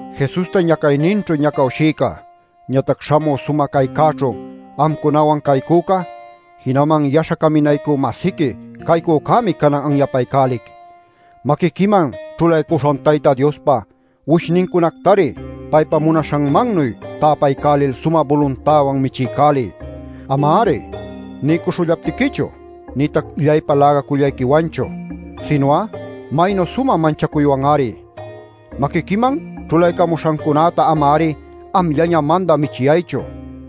Jesusta ñacayninćhu ñacawshïca, ñatac śhamü sumä caycäćhu amcunawan caycüca, jinaman yaśha caminaycü-masiqui caycücämi canan anyapaycälic: Maquiquiman ćhulaycuśhan Tayta Diospa uwishnincunactari paypa munaśhanmannuy täpaycälil sumä buluntäwan michiycäliy; ama-ari niycuśhullaptiquichu nïtac illaypa läga-cayllayquiwanchu, sinu'a maynu sumä munacuśhayquiwan-ari. Maquiquiman ćhulaycamuśhancunäta ama-ari amllaña mandä michiyaychu,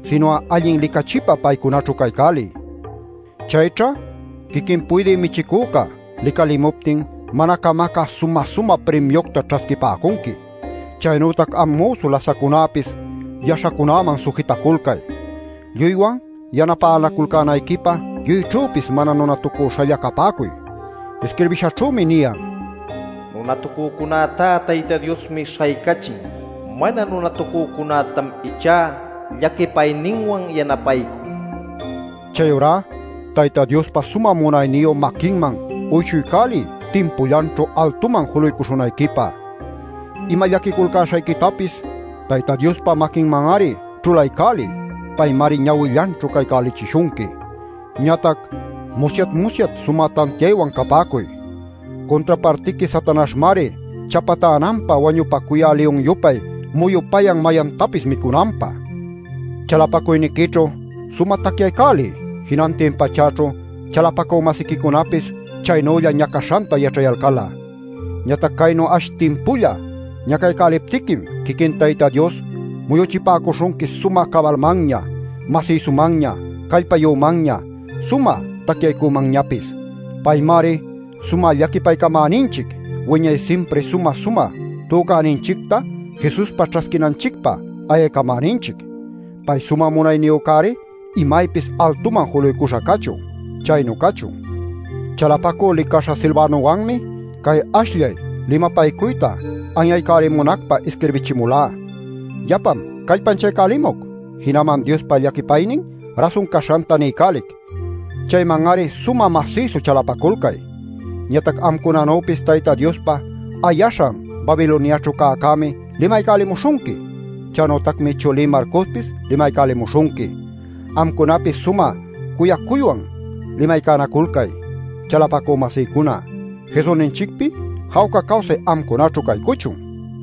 sinu'a allin licachipa paycunaćhu caycäliy. Chayćhá quiquin Puydï Michicüca licalimuptin mana camacä sumä-sumä primiucta ćhasquipäcunqui. Chaynütac am müsu lasaccunäpis yaśhacunäman sujitaculcay. Lluywan yanapänaculcänayquipä lluyćhüpis mana nunatucüśhalla capäcuy. Isquirbishaćhümi niyan: “Nunatucücunätá Tayta Diosmi śhaycachin; mana nunatucücunätam ichá llaquipayninwan yanapaycun” nil. Chayurá Tayta Diospa sumä munayniyu maquinman uyshuycäliy timpullanćhu altuman juluycuśhunayquipä. Ima llaquiculcäśhayquitapis Tayta Diospa maquinman-ari ćhulaycäliy; paymari ñawillanćhu cayalcächishunqui. Ñatac musyat-musyat sumä tantiaywan capäcuy; cuntrapartiqui Satanaśhmari chapatänanpä wañupacuyä liyun-yupay muyupayan mayantapis micunanpä. Chalapacuyniquićhu sumä tacyaycäliy, jinantin pachäćhu chalapacü-masiquicunapis chaynülla ñacaśhanta yaćhayalcal'a. Ñatac caynu ash timpulla ñacaycäliptiquim quiquin Tayta Dios muyuchipäcuśhunqui sumä cabalmanña, masïsumanña, callpayümanña, sumä tacyaycümanñapis. Paymari sumä llaquipaycamäninchic, wiñay simpri sumä-sumä tücäninchicta Jesuspa ćhasquinanchicpä ayaycamäninchic. Pay sumä munayniyücäri imaypis altuman juluycuśha cachun. Chaynu cachun. Chalapacüpa licaśha Silvanowanmi cay ashllay limapaycuyta anyaycälimunacpä isquirbichimulá. Yapam callpanchaycälimuc. Jinaman Diospa llaquipaynin rasun caśhanta niycälic; chayman-ari sumä masïsu chalapaculcay. Ñatac amcunanüpis Tayta Diospa ayaśhan Babiloniaćhu cäcämi limaycälimuśhunqui. Chaynütacmi chulí Marcospis limaycälimuśhunqui. Amcunapis sumä cuyacuywan limaycanaculcay. Chalapacü-masïcuna Jesusninchicpi jawca cawsay amcunaćhu caycuchun.